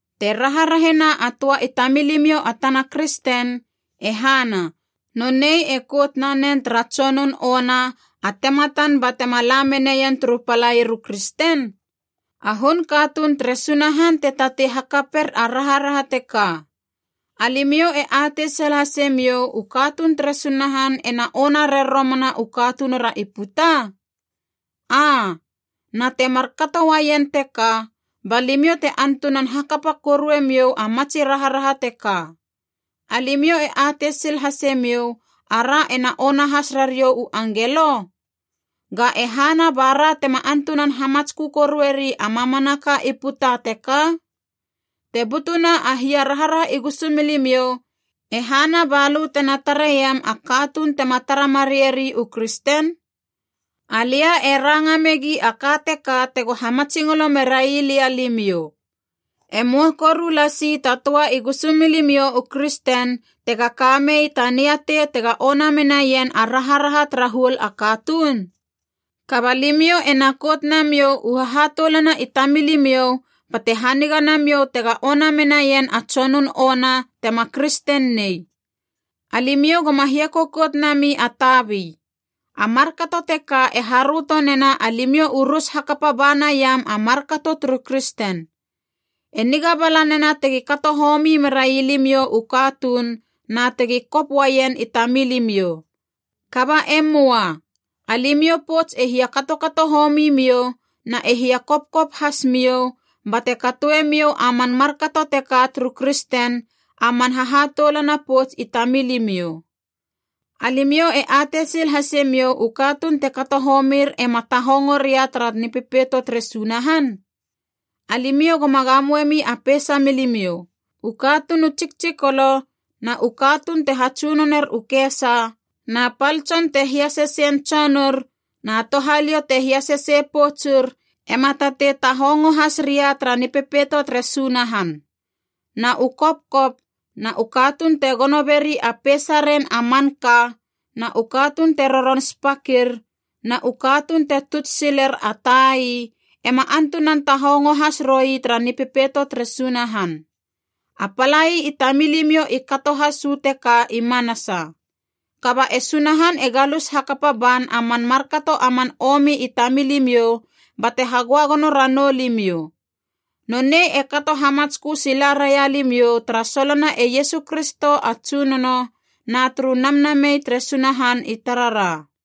Te raharahena a töa i tamilimiou a tana kristen, e hana, nonei e kout nanen tara tsonun ona a tematan batema la meneien turu palair u kristen? A hun katuun tere Sunahan te tatei hakaper a raharaha teka. Alimiou e atei sil hasemiou u katuun tere Sunahan ena ona rer romana u katunura i puta? Aa. Na temar kato uaien teka, ba limiou te antunan hakapa korue miou a matsi raharaha teka. Alimiou e atei sil hasemiou ara ena ona has rariou u angelo? Ga e hana ba ra tema antunan hamatskö korueri a mamanaka i puta teka? Te butuna a hia raharaha i gusumilimiou, e hana balö tena tareiem a katuun tema tara mareieri u kristen? Alia e ranga megi a ka teka tego hamatsingolo merailia alimiou. E möa koru lasi ta töa i gusumilimiou u kristen tega ka mei ta niatei tega ona menaien a raharaha tara huol a katuun? Kaba limiou ena kout namiou u hahatoulana i tamilimiou bate haniga namiou tega ona menaien a tsonun ona tema kristen nei. Alimiou goma hiakokot nami a tabi. A markato teka e haröto nena alimiou u rus hakapa ba naiam a markato turu kristen. E niga bala nena tegi kato homi merai limiou u katuun na tegi kop uaien i tamilimiou. Kaba e möa, alimiou pouts e hia katokato homi miou na e hia kopkop hasmiou, bate katoemiou a man markato teka turu kristen, a man hahatoulana pouts i tamilimiou. Alimiou e atei sil hasemiou u katuun te kato homir ema tahongo ria tara Nipepeito tere Sunahan? Alimiou goma gamoemi a peisa milimiou. U katuun u tsiktsikolo na u katuun te hatsunoner u kesa na pal tson te hiasesein tsonur na touhaliou te hiasesei poutsur ema tatei tahongo has ria tara Nipepeito tere Sunahan. Na u kopkop na u katuun te gono beri a peisaren a manka na u katuun te roron spakir na u katuun te tuts siler a tai ema antunan tahongo has roi tara Nipepeito tere Sunahan. A palai i tamilimiou i kato has uu teka i manasa. Kaba e Sunahan e galus hakapa ban a man markato a man omi i tamilimiou bate hagöagono ranou limiou. Nonei e kato hamatskö sila raia limiou tara solona e Iesu Kristo a Tsunono na turu Namnamei tere Sunahan i tarara.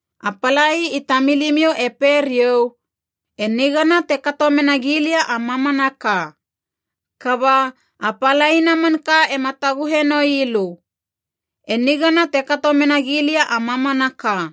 A palai i tamilimiou e pei riou, “E nigana te kato mena gilia a mamanaka.” Kaba, a palaina manka ema taguhe noi lö. “E nigana te kato mena gilia a mamanaka.”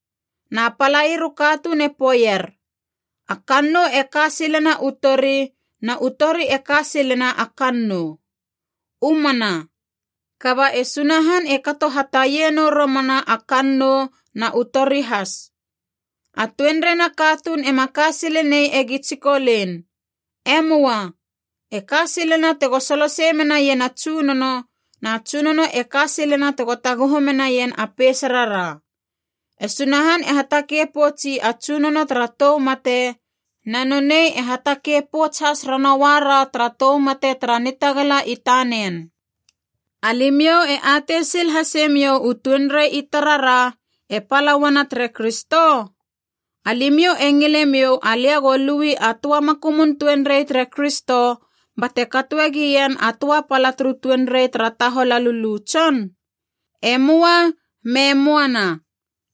Na palair u katuun e poeier, “A kannou e ka silena u tori, na u tori e ka silena a kannou.” U mana, kaba e Sunahan e kato hataie nou romana a kannou na u tori has. A tuenriena katuun ema ka sile nei egi tsikolein. E möa. E ka silena tego solosei menaien a Tsunono, na Tsunono e ka silena tega taguhu menaien a peisarara. E Sunahan e hatakei poutsi a Tsunono tara tou mate, na nonei e hatakei pouts has ranoua ra tara tou mate tara nitagala i tanen. Alimiou e atei sil hase miou u tuenrei i tarara, e pala uana tere Kristo? Alimiou e ngilemiou alia go lui a töa makumun tuenrei tere Kristo bate katoe gien a töa pala turu tuenrei tara tahol a lulu tson? E möa, me möana!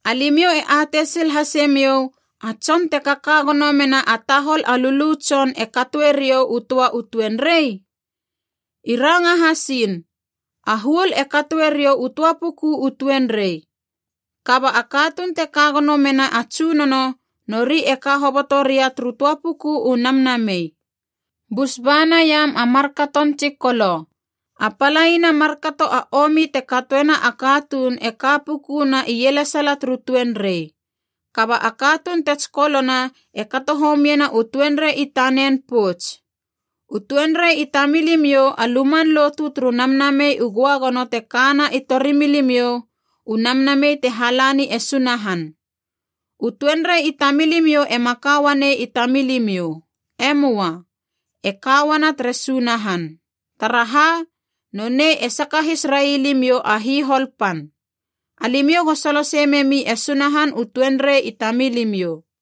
Alimiou e atei sil hase miou, a tson te kaka gono mena a tahol a lulu tson e katoe riou u töa u tuenrei? I ranga hasiin, “A huol e katoe riou u töa puku u tuenrei.” Kaba a katuun te ka gono mena a Tsunono, nori e ka hoboto ria turu töa puku u namnamei. Bus ba naiam a markaton tsikolo. A palaina markato a omi te katoena a katuun e ka puku na ielesala turu tuenrei. Kaba a katuun te tsikolona e kato homiena u tuenrei i tanen pouts. U tuenrei i tamilimiou a luman lotu turu Namnamei u Göagono te kana i tori milimiou, u Namnamei te halani e Sunahan. U tuenrei i tamilimiou ema ka uanei i tamilimiou. E möa. E ka uana tere Sunahan. Taraha, nonei e sakahis rai limiou a hihol pan. Alimiou go solosei memi e Sunahan u tuenrei i tamilimiou.